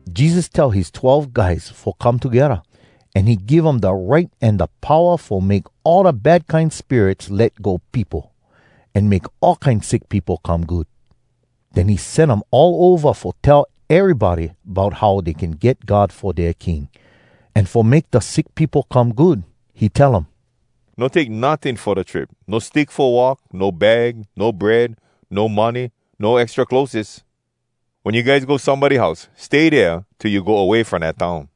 Jesus tell his twelve guys fo come togedda, an he give um da right an da powa fo make all da bad kine spirits let go peopo, an make all kine sick peopo come good. Den he sen um all ova fo tell erybody bout how dey can get God fo dea king, an fo make da sick peopo come good. He tell um, “No take notting fo da trip; no stick fo walk, no bag, no bread, no money, no extra clotheses. Wen you guys go somebody house, stay dea till you go way from dat town.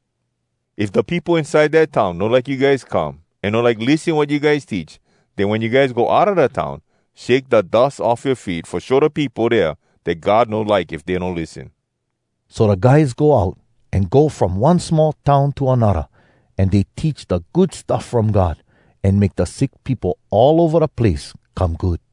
If da peopo inside da town no like you guys come, an no like lissen wat you guys teach, den wen you guys go outa da town, shake da dus off yoa feet fo show da peopo dea dat God no like if dey no lissen.” So da guys go out an go from one small town to anodda, an dey teach da Good Stuff From God, an make da sick peopo all ova da place come good.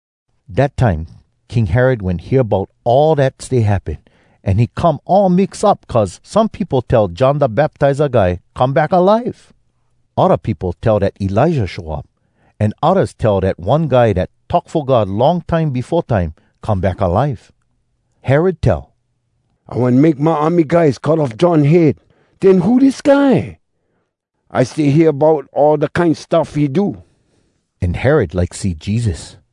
Dat time King Herod wen hear bout all dat stay happen. An he come all mix up, cuz some peopo tell John Da Baptiza Guy come back alive. Odda peopo tell dat Elijah show up. An oddas tell dat one guy dat talk fo God long time befo time come back alive. Herod tell, “I wen make my army guys cut off John head. Den who dis guy? I stay hear bout all da kine stuff he do.” An Herod like see Jesus.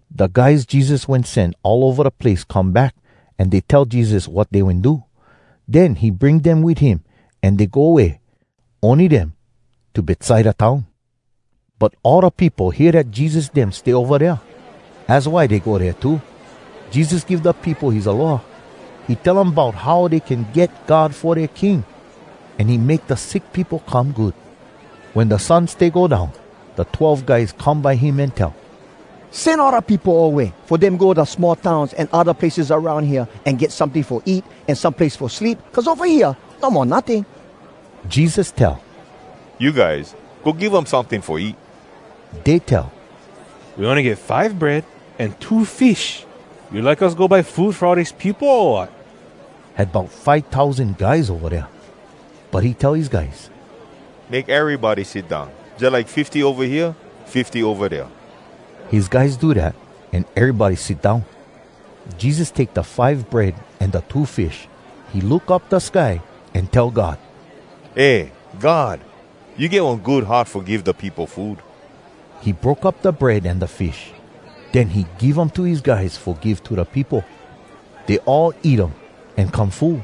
Da guys Jesus wen sen all ova da place come back, an dey tell Jesus wat dey wen do. Den he bring dem wit him an dey go way ony dem to Betsaida town. But all da peopo hear dat Jesus dem stay ova dea, az why dey go dea too. Jesus give da peopo his aloha. He tell um bout how dey can get God fo dea king, an he make da sick peopo come good. Wen da sun stay go down, da twelve guys come by him an tell, “Sen all da peopo away fo dem go da small towns an odda places aroun hea an get someting fo eat an some place fo sleep, cuz ova hea no mo notting.” Jesus tell, “You guys, go give um someting fo eat.” Dey tell, “We ony get five bread an two fish. You like us go buy food fo all dis peopo, o wat?” (Had bout five tousan guys ova dea.) But he tell his guys, “Make erybody sit down, jalike fifty ova hea, fifty ova dea.” His guys do dat, an erybody sit down. Jesus take da five bread an da two fish. He look up da sky, an tell God “Eh God! You get one good heart fo give da peopo food!” He broke up da bread an da fish. Den he give um to his guys fo give to da peopo. Dey all eat um, an come full.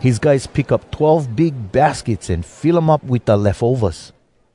His guys pick up twelve big baskets an fill um up wit da lefovas.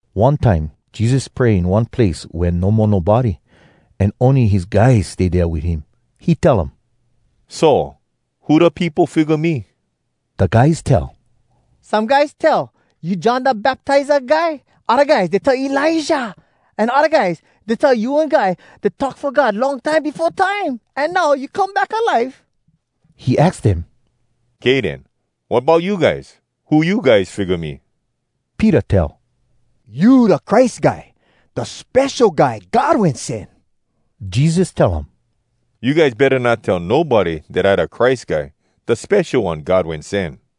One time Jesus pray in one place wea no mo nobody, an ony his guys stay dea wit him. He tell um, “So! Who da peopo figga me?” Da guys tell, “Some guys tell you John Da Baptiza Guy. Odda guys tell Elijah. An odda guys tell you one guy dat talk fo God long time befo time, an now you come back alive.” He aks dem, “Kay den, wat bout you guys? Who you guys figga me?” Peter tell, “You da Christ Guy, da Spesho Guy God Wen Sen.” Jesus tell um, “You guys betta not tell nobody dat I da Christ Guy, da Spesho One God wen sen.”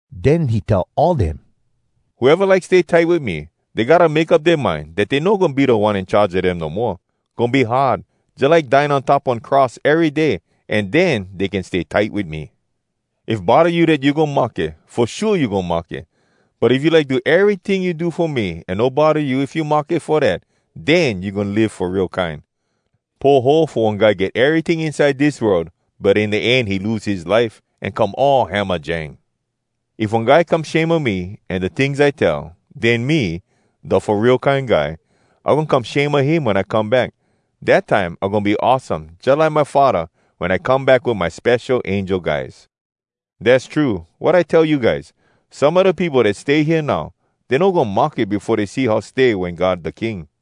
Den he tell all dem, “Whoeva like stay tight wit me, dey gotta make up dea mind dat dey no goin be da one in charge a dem no moa. Goin be hard, jalike dying on top one cross ery day. An den dey can stay tight wit me. If bodda you dat you goin mahke, fo shua you goin mahke. But if you like do eryting you do fo me, an no bodda you if you mahke fo dat, den you goin live fo real kine. Poho fo one guy get eryting inside dis world, but in da end he lose his life, an come all hamajang. If one guy come shame a me an da tings I tell, den me, da Fo Real Kine Guy, I goin come shame a him wen I come back. Dat time I goin be awesome jalike my Faddah, wen I come back wit my spesho angel guys. Dass true, wat I tell you guys: Some a da peopo dat stay hea now, dey no goin mahke befo dey see how stay wen God da king.”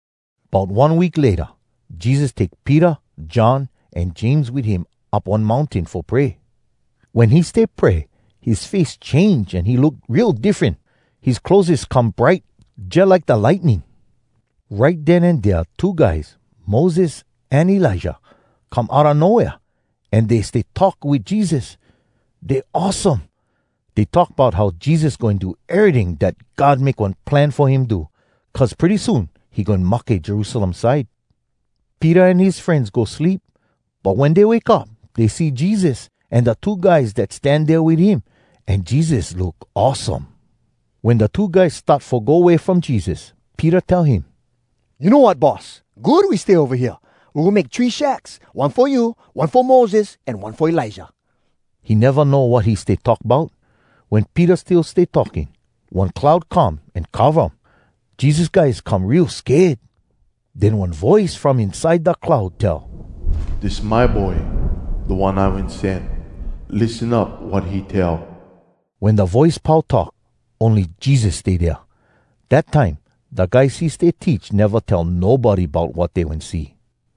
Bout one week layta, Jesus take Peter, John, an James wit him up one mountain fo pray. Wen he stay pray, his face change an he look real diffren. His clotheses come bright jalike da lightning. Right den an dea two guys, Moses an Elijah, come outa no wea, an dey stay talk wit Jesus! Dey awesome. Dey talk bout how Jesus goin do eryting dat God make one plan fo him do, cuz pretty soon he goin mahke Jerusalem side. Peter an his frenz go sleep. But wen dey wake up, dey see Jesus, an da two guys dat stan dea wit him. An Jesus look awesome. Wen da two guys start fo go way from Jesus, Peter tell him, “You know wat, Boss? Good we stay ova hea! We goin make three shacks, one fo you, one fo Moses, an one fo Elijah!” (He neva know wat he stay talk bout.) Wen Peter still stay talking, one cloud come an cova um. Jesus guys come real sked. Den one voice from inside da cloud tell, “Dis my boy, da One I wen sen. Lissen up wat he tell!” Wen da voice pau talk, ony Jesus stay dea. Dat time da guys he stay teach neva tell nobody bout wat dey wen see.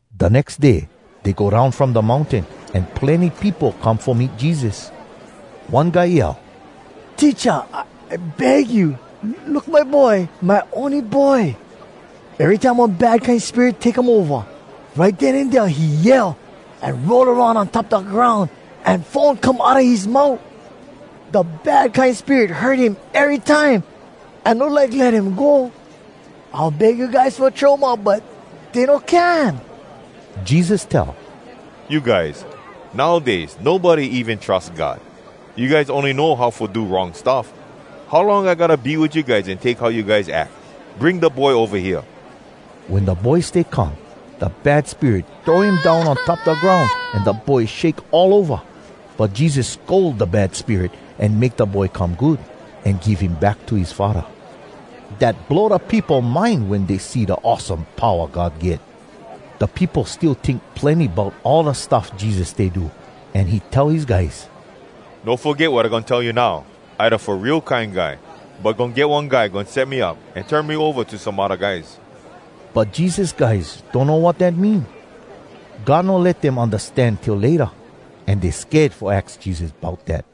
Da nex day dey go down from da mountain, an plenny peopo come fo meet Jesus. One guy yell, “Teacha! I beg you, look my boy, my ony boy! Erytime one bad kine spirit take um ova, right den an dea he yell, an roll aroun on top da groun, an foam come outa his mout. Da bad kine spirit hurt him erytime, an no like let him go. I wen beg yoa guys fo throw um out, but dey no can.” Jesus tell, “You guys! Nowdays nobody even trus God! You guys ony know how fo do wrong stuff! How long I gotta be wit you guys an take how you guys ack? Bring da boy ova hea!” Wen da boy stay come, da bad spirit throw him down on top da groun an da boy shake all ova. But Jesus scold da bad spirit, an make da boy come good, an give him back to his faddah. Dat blow da peopo mind wen dey see da awesome powa God get. Da peopo still tink plenny bout all da stuff Jesus stay do, an he tell his guys, “No foget wat I goin tell you now! I da Fo Real Kine Guy. But goin get one guy goin set me up an turn me ova to some odda guys.” But Jesus guys donno wat dat mean. God no let dem undastan till layta, an dey sked fo aks Jesus bout dat.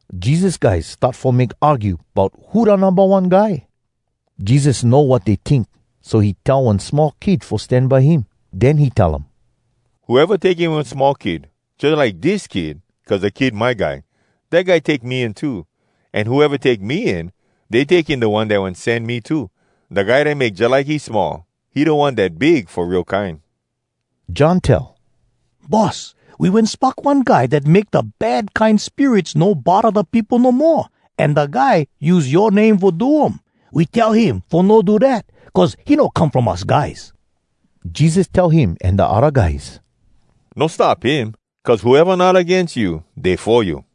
Jesus guys start fo make argue bout who da numba one guy. Jesus know wat dey tink, so he tell one small kid fo stan by him. Den he tell um, “Whoeva take in one small kid jalike dis kid cuz da kid my guy, dat guy take me in too. An whoeva take me in, dey take in da One dat wen sen me too. Da guy dat make jalike he small, he da one dat big fo real kine.” John tell, “Boss, we wen spock one guy dat make da bad kine spirits no bodda da peopo no moa, an da guy use yoa name fo do um. We tell him fo no do dat, cuz he no come from us guys.” Jesus tell him an da odda guys, “No stop him, cuz whoeva not agains you, dey fo you.”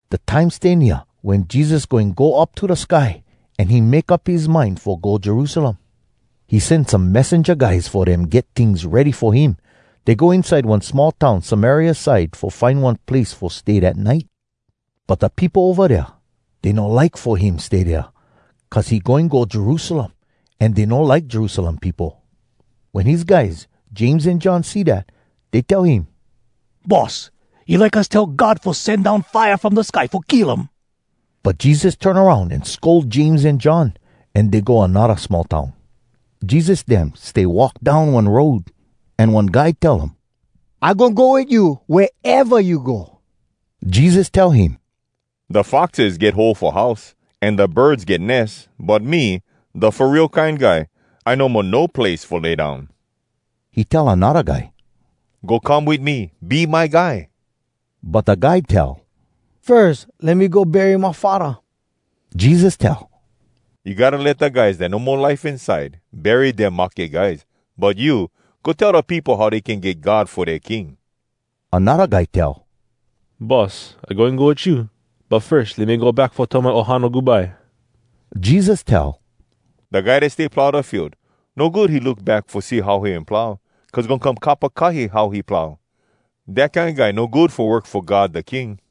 Da time stay nea wen Jesus goin go up to da sky, an he make up his mind fo go Jerusalem. He sen some messenja guys fo dem get tings ready fo him. Dey go inside one small town Samaria side fo find one place fo stay dat nite. But da peopo ova dea, dey no like fo him stay dea, cuz he goin go Jerusalem, an dey no like Jerusalem peopo. Wen his guys James an John see dat, dey tell him, “Boss, you like us tell God fo sen down fire from da sky fo kill um?” But Jesus turn aroun an scold James an John. An dey go anodda small town. Jesus dem stay walk down one road, an one guy tell um, “I goin go wit you wea eva you go.” Jesus tell him, “Da foxes get hole fo house, an da birds get nes. But me, Da Fo Real Kine Guy, I no mo no place fo lay down.” He tell anodda guy, “Go come wit me. Be my guy.” But da guy tell, “Firs let me go bury my faddah.” Jesus tell, “You gotta let da guys dat no mo life inside bury dea mahke guys. But you, go tell da peopo how dey can get God fo dea king.” Anodda guy tell, “Boss, I goin go wit you, but firs let me go back fo tell my ohana goodbye.” Jesus tell, “Da guy dat stay plow da field, no good he look back fo see how he wen plow cuz goin come kapakahi how he plow. Dat kine guy no good fo work fo God da King.”